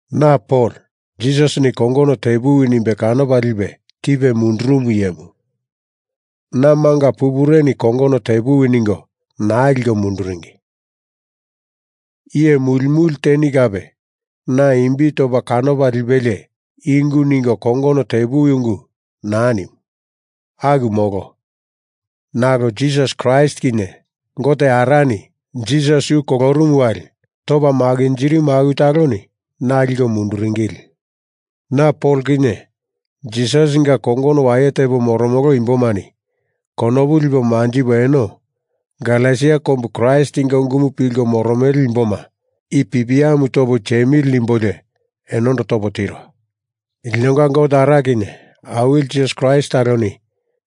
Na Pol Jisasini kongono tepuwi nimbe kanopa lipe tipe mundurumu iyemu. Na manga pupureni kongono tepuwi ningo naa liko munduringi. Iye muli muli teni kape na imbi topa kanopa lipelie i ungu ningo kongono tepuwi ungu naa nimu. Aku molo. Nalo Jisasi Kraist kinye Gote Arani Jisasi yu kolorumu wali topa makinjirimumu aku taloni na liko munduringili. Na Pol kinye Jisasinga kongono waye tepo moromolo imbomani konopu lipo manjipo eno Galesia kombu Kraistinga ungumu pilko moromele imboma i pipiamu topo tiemili nimbolio enondo topo tiro. Linonga Gote Ara kinye Awili Jisasi Kraist taloni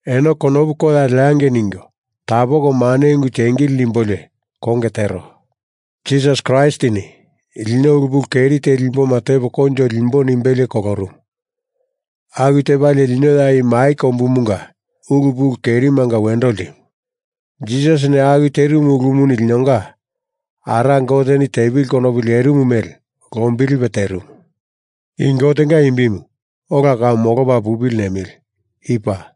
eno konopu koya leangei ningo tapoko mane ungu tiengili nimbolio konge tero. Jisasi Kraistini lino ulu pulu keri teli imboma tepo koinjo limbo nimbelie kolorumu. Aku tepalie lino ya i mai kombumunga ulu pulu kerimanga wendo ltimu. Jisasini aku terimu ulumu linonga Ara Goteni tepili konopu lerimu mele lombilipe terimu. I Gotenga imbimu ola kau molopa pupili nemili. I paa.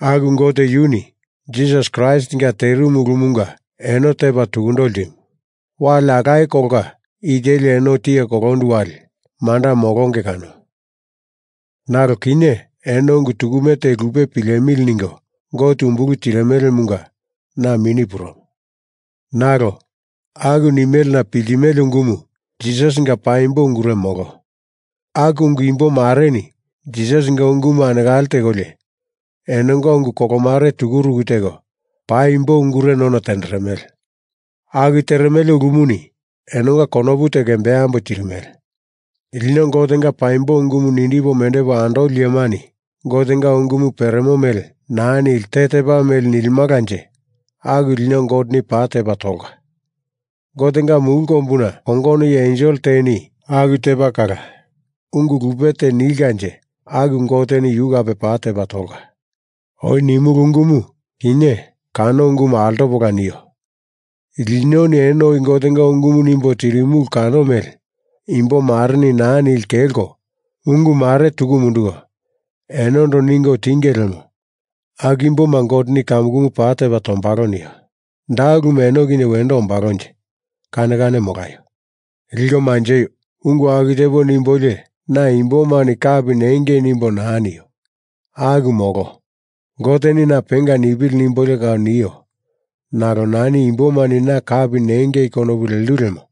Aku Gote yuni Jisasi Kraistinga terimu ulumunga eno tepa tukundo ltimu. Wali alaye kolonga i teli eno tiye kolondu wali manda molonge kano. Nalo kinye eno ungu tukume te lupe pilemili ningo Gote umbulu tirimelemunga na mini purumo. Nalo aku nimelena piltimele ungumu Jisasinga paimbo ungure molo. Aku ungu imbo mareni Jisasinga ungumu anekale tekolio enonga ungu kolomare tukuruku teko paimbo ungure none tenderemele. Aku teremele ulumuni enonga konopu teko embambo tirimele. Lino Gotenga paimbo ungumu nindipo mendepo andoli iyemani Gotenga ungumu peremo mele naa nili te tepa mele nilimalanje aku lino Goteni paa tepa tolka. Gotenga mulu kombuna kongono iye ensel teni aku tepa kala ungu lupe te nilkanje aku Goteni yu kape paa tepa tolka. Oi nimulu ungumu kinye kano ungumu altopola nio! Linoni eno oi Gotenga ungumu nimbo tirimulu kano mele imbo mareni naa nili kelko ungu mare tuku munduko enondo ningo tinge lemo aku imboma Goteni kamukumu paa tepa tombalo nio. Da ulumu eno kinye wendo ombalonje? Kane kane molaio. Liko manjeio! Ungu aku tepo nimbolio na imbomani kapi nengei nimbo naa nio. Aku molo. Goteni na penga nipili nimbolio kau nio nalo nani imbomani na kapi nengei konopu lendu lemo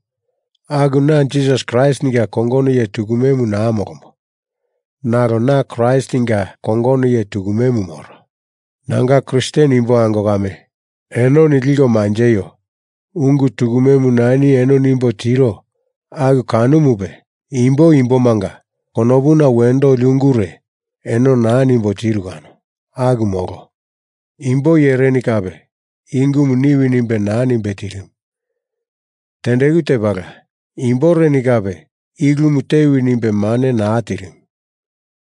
aku na Jisasi Kraistinga kongono iye tukumemu naa molombo. Nalo na Kraistinga kongono iye tukumemu moro. Nanga Kristen imbo ango kame, enoni liko manjeio. Ungu tukumemu nani eno nimbo tiro aku kanomupe imbo imbomanga konopuna wendo oli ungure eno naa nimbo tiru kano. Aku molo. Imbo iyereni kape i ungumu niwi nimbe naa nimbe tirimu. Tendeku tepala imboreni kape i ulumu tewi nimbe mane naa tirimu.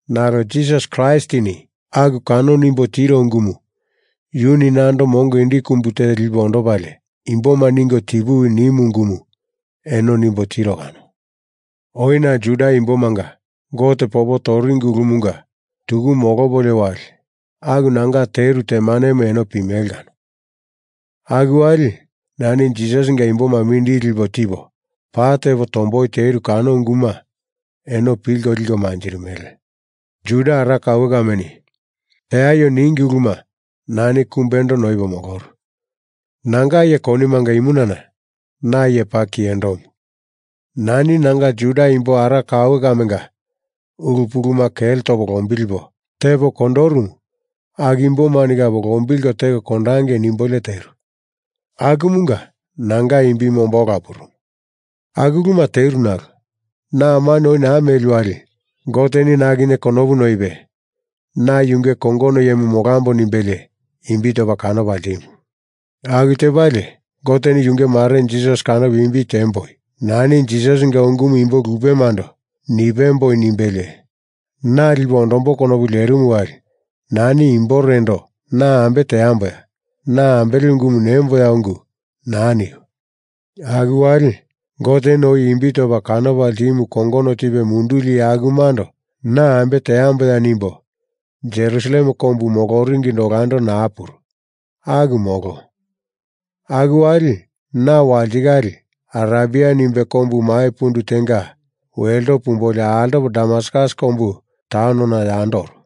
Nalo Jisasi Kraistini aku kano nimbo tiro ungumu yuni nando mongo indi kumbu te lipe ondopalie imboma ningo tipuwi nimu ungumu eno nimbo tiro kano. Oi na Juda imbomanga Gote popo toringi ulumunga tuku molopolio wali aku nanga teru temanemu eno pimele kano. Aku wali nani Jisasinga imboma mindili lipo tipo paa tepo tomboi teru kano unguma eno pilko liko manjirimele. Juda ara kaue kameni teaio ningi uluma nani kumbendo noipo moloru. Nanga iye konimanga imunana na iye paa kiyendomu. Nani nanga Juda imbo ara kaue kamenga ulu puluma kele topo lombilipo tepo kondorumu aku imbomani kape lombilko teko kondangei nimbolio teru. Akumunga nanga imbimu omba ola purumu. Aku uluma teru nalo na amani oi naa meli wali Goteni na kinye konopu noipe na yunge kongono iyemu molambo nimbelie imbi topa kanopa ltimu. Aku tepalie Goteni yunge marenu Jisasi kanopo imbi tiemboi nani Jisasinga ungumu imbo lupemando nipemboi nimbelie na lipo ondombo konopu lerimu wali nani imborendo na ambe teamboya na ambele ungumu nemboya ungu naa niu. Aku wali Goteni oi imbi topa kanopa ltimu kongono tipe munduli iye akumando na ambe teamboya nimbo Jerusalem kombu moloringindo olando naa puru. Aku molo. Aku wali na walitikale Arebia nimbe kombu mai pundu tenga welto pumbolio altopo Damaskus kombu taunona yando oru.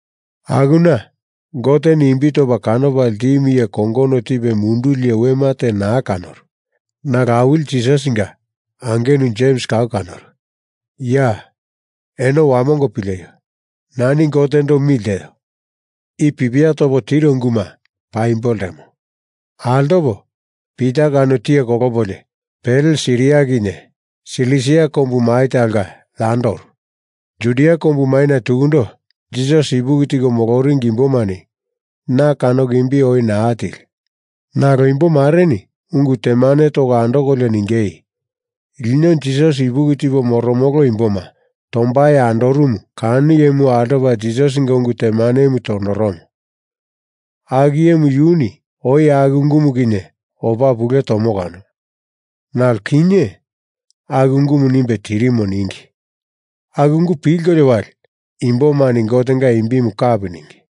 Akuna Goteni imbi topa kanopa ltimu iye kongono tipe munduli wema te naa kanoru. Nalo Awili Jisasinga angenu Jems kau kanoru. Ya! Eno wamongo pileio! Nani Gotendo mi lteo. I pipia topo tiro unguma paimbo ltemo. Altopo Pita kano tiye kolopolio pele Siria kinye Silisia kombu mai talonga yando oru. Judia kombu maina tukundo Jisasi ipuki tiko moloringi imbomani na kanoko imbi oi naa tili. Nalo imbo mareni ungu temane toko andokolio ningei, “Lino Jisasi ipuki tipo moromolo imboma tombai andorumu kano iyemuni altopa Jisasinga ungu temanemu tondoromo. Aku iyemu yuni oi aku ungumu kinye opa pule tomo kano. Nalo kinye aku ungumu nimbe tirimo,” ningi. Aku ungu pilkolio wali imbomani Gotenga imbimu kapi ningi.